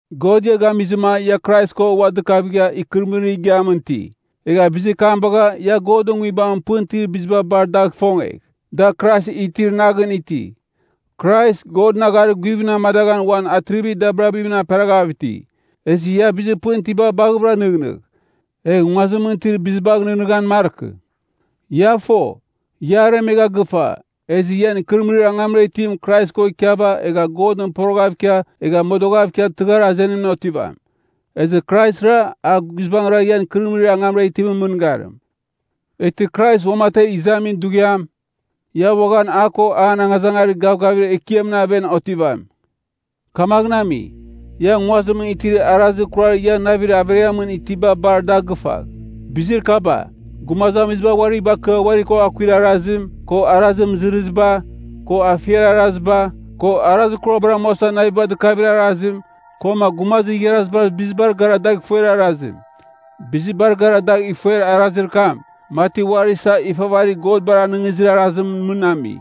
God ia gamizɨma ia Krais ko ua dɨkavigha ikɨrɨmɨrir igiamɨn iti. Egha bizir kam bagha, ia Godɨn Nguibamɨn pɨn itir biziba bar dagh ifongegh, da Krais itir naghɨn iti. Krais, Godɨn agharir guvimɨn amadaghan uan atrivir dabirabimɨn aperaghav iti. Ezɨ ia bizir pɨn itiba baghɨvɨra nɨghnɨgh, egh nguazimɨn itir bizibagh nɨghnɨghan markɨ. Ia fo, ia aremegha gɨfa, ezɨ ian ikɨrɨmɨrir angamra itim Krais ko ikiava egha Godɨn poroghav ikia egha modoghav ikia tɨghar azenimɨn otivam. Ezɨ Kraisra, a guizbangɨra ian ikɨrɨmɨrir angamra itimɨn mɨngarim. Eghtɨ Krais uamategh izamin dughiam, ia uaghan a ko an angazangarir gavgavir ekiamɨn aven otivam. Kamaghɨn ami, ia nguazimɨn itir arazir kurar ian navir averiamɨn itiba bar da gɨfagh. Bizir kaba, gumazamiziba uari bakɨa uari ko akuir arazim, ko arazir mɨzɨrɨziba, ko afiar araziba, ko arazir kurabar amuasa naviba dɨkavir arazim, koma gumazir igharazibar bizibar gara da ifuer arazim. Bizibar gara dagh ifuer arazir kam, mati uari isa ifavarir godbar anɨngizir arazimɨn mɨn ami.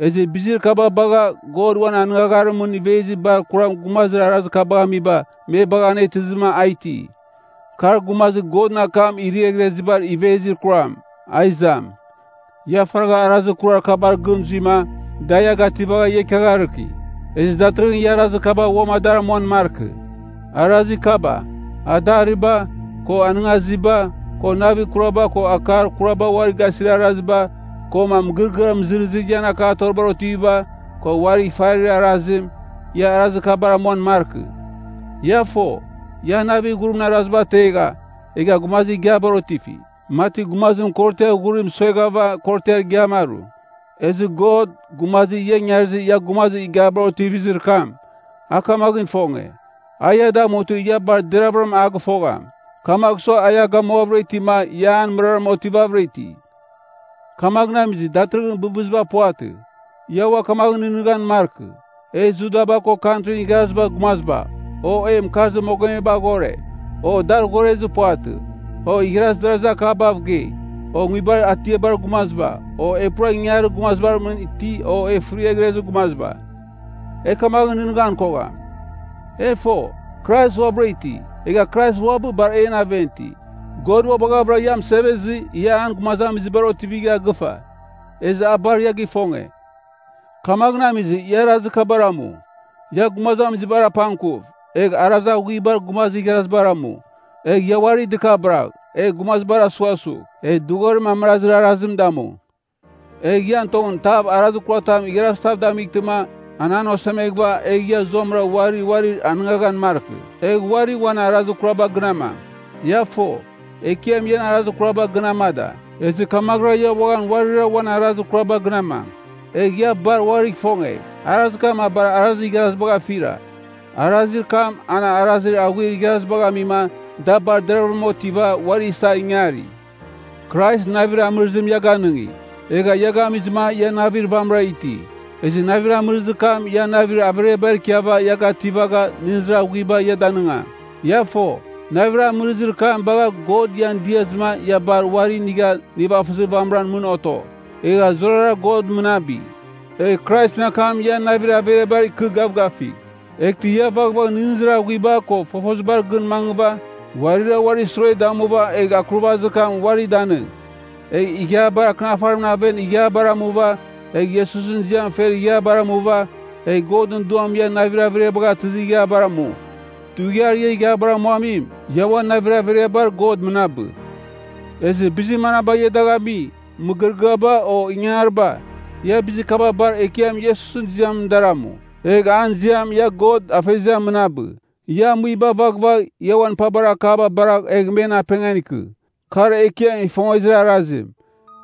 Ezɨ bizir kaba bagha God uan anɨngagharimɨn ivezir bar kuram gumazir arazir kabagh amiba me bagha anetɨzɨma a iti. Kar gumazir Godɨn akam iriaghriazibar ivezir kuram. A izam. Ia faragha arazir kurar kabar gɨn zuima, da ia gativagha ia ikiagharɨki. Ezɨ datɨrɨghɨn ia arazir kaba uam adar amuan markɨ. Arazir kaba: adariba, ko anɨngaziba, ko navir kuraba ko akar kuraba uari gasir araziba, koma mɨgɨrɨgɨar mɨzɨrɨzir ian akatoribar otiviba, ko uarigh ifarir arazim, ia arazir kabar amuan markɨ. Ia fo, ia navir ghurimɨn araziba ategha egha gumazir igiabar otifi, mati gumazim korotiar ghurim sueghava korotiar igiam aru. Ezɨ God, gumazir ian ingarizɨ ia gumazir igiabar otivizir kam, a kamaghɨn ifonge, a ia damutɨ ia bar deravɨram a gɨfogham. Kamagh sua a ia gamuavɨra itima ia an mɨraram otivavɨra iti. Kamaghɨn amizɨ, datɨrɨghɨn bɨbɨziba puvatɨ. Ia ua kamaghɨn nɨghnɨghan markɨ, e Judaba ko Kantrin Igharazibar Gumaziba, o e mɨkarzir mogomeba aghore, o daghorezir puvatɨ, o igharazir darazir akabav gei, o nguibar atiabar gumaziba, o e pura ingangarir gumazibar iti o e fɨriaghrezir gumaziba. E kamaghɨn nɨghnɨghan kogham. E fo, Krais uabɨra iti, egha Krais uabɨ bar en aven iti. God ua baghavɨra ia mɨsevezɨ, ia an gumazamizibar otivigha gɨfa, ezɨ a bar ia gifonge. Kamaghɨn amizɨ, ia arazir kabar amu: Ia gumazamizibar apangkuv, egh arazir aghuibar gumazir igharazibar amu, egh ia uari dɨkabɨragh, egh gumazibar asughasugh, egh dɨghorim amɨrazir arazim damu. Egh ian tongɨn tav arazir kuratam igharazitav damightɨma an an osemeghɨva, egh ia zuamɨra uari uarir anɨngaghan markɨ, egh uari uan arazir kuraba gɨn amang. Ia fo, Ekiam ian arazir kuraba gɨn amada, ezɨ kamaghɨra ia uaghan uarira uan arazir kuraba gɨn amang. Egh ia bar uarigh ifongegh. Arazir kam a bar arazir igharazibagh afira. Arazir kam, an arazir aghuir igharazibagh amima da bar deravɨram otiva, uari isa ingari. Krais navir amɨrɨzim ia ganɨngi, egha ia gamizɨma ia navir vamɨra iti, ezɨ navir amɨrɨzir kam ian navir averiabar ikɨva ia gativaghɨva nɨghnɨzir aghuiba ia danɨngam. Ia fo, navir amɨrɨzir kam bagha God ian diazɨma ia bar uari inigha nivafɨzir vamɨran mɨn oto. Egh zurara God mɨnabɨ. Egh Kraisɨn akam ian navir averiabar ikɨ gavgafigh. Eghtɨ ia vaghvagh nɨghnɨzir aghuiba ko fofozibar gɨn mangɨva uarira uarir sure damuva egh akurvazir akam uari danɨng. Egh Ighiabar Akɨnafarimɨn aven ighiabar amuva, egh Iesusɨn ziam fer ighiabar amuva, egh Godɨn Duam ian navir averiabagh atɨzir ighiabar amu. Dughiar ia ighiabar amuamim, ia uan navir averiabar God mɨnabɨ. Ezɨ bizir manaba ia dagh ami, mɨgɨrɨgɨaba o ingangariba, ia bizir kaba bar Ekiam Iesusɨn ziamɨn dar amu. Egh an ziamɨn ia God Afeziam mɨnabɨ. Ia amuiba vaghvagh, ia uan pabar akaba baragh egh men apengan ikɨ. Kar Ekiam ifongezir arazim.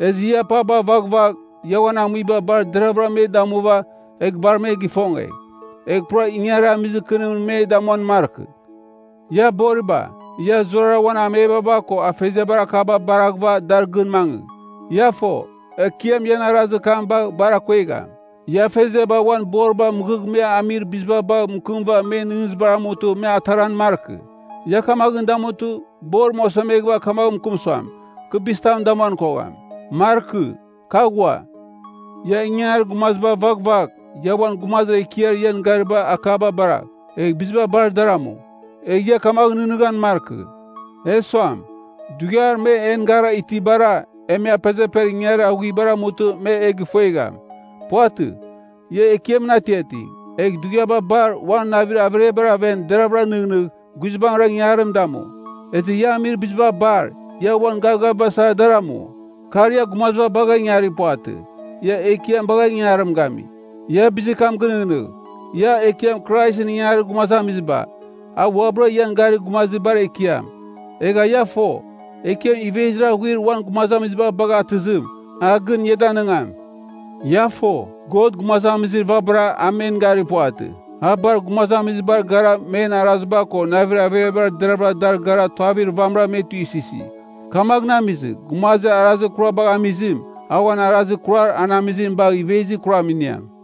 Ezɨ ia paba vaghvagh, ia uan amuiba bar deraghvɨra me damuva egh bar me gifongegh. Egh pura ingangarir amizir kɨnimɨn mɨn me damuan markɨ. Ia boriba, ia zurara uan amebaba ko afeziabar akaba baraghɨva dar gɨn mangɨ. Ia fo, Ekiam ian arazir kam bagh bar akuegham. Ia afeziaba uan boriba mɨghɨ me amir biziba bagh mɨkɨmɨva men nɨghnɨzibar amutɨ me ataran markɨ. Ia kamaghɨn damutɨ, borim osemeghɨva kamaghɨn mɨkɨm suam, kɨ bizitam damuan kogham. Markɨ. Kɨ aghua. Ia ingangarir gumaziba vaghvagh, ia uan gumazir ekiar ian garibar akaba baragh, egh biziba bar dar amu. Egh ia kamaghɨn nɨghnɨghan markɨ, “E suam, dughiar me en gara itibar, e me apezeper ingangarir aghuibar amutɨ me e gifuegham.” Puvatɨ. Ia Ekiamɨn atiating, egh dughiaba bar uan navir averiabar aven deravɨra nɨghnɨgh, guizbangɨra ingangarim damu. Ezɨ ia amir biziba bar, ia uan gavgaviba sara dar amu. Kar, ia gumaziba bagha ingarir puvatɨ. Ia Ekiam bagha ingangarim gami. Ia bizir kam gɨnɨghnɨgh, ia Ekiam Kraisɨn ingangarir gumazamiziba, a uabɨra ian garir gumazir bar ekiam. Egha ia fo, Ekiam ivezir aghuir uan gumazamiziba bagha atɨzim, a gɨn ia danɨngam. Ia fo, God gumazamizir vabara a men garir puvatɨ, a bar gumazamizibar gara men araziba ko navir averiabar deravɨra dar gara tuavir vamɨra me tuisɨsi. Kamaghɨn amizɨ, gumazir arazir kurabagh amizim, a uan arazir kurar an amizim bagh ivezir kuram iniam.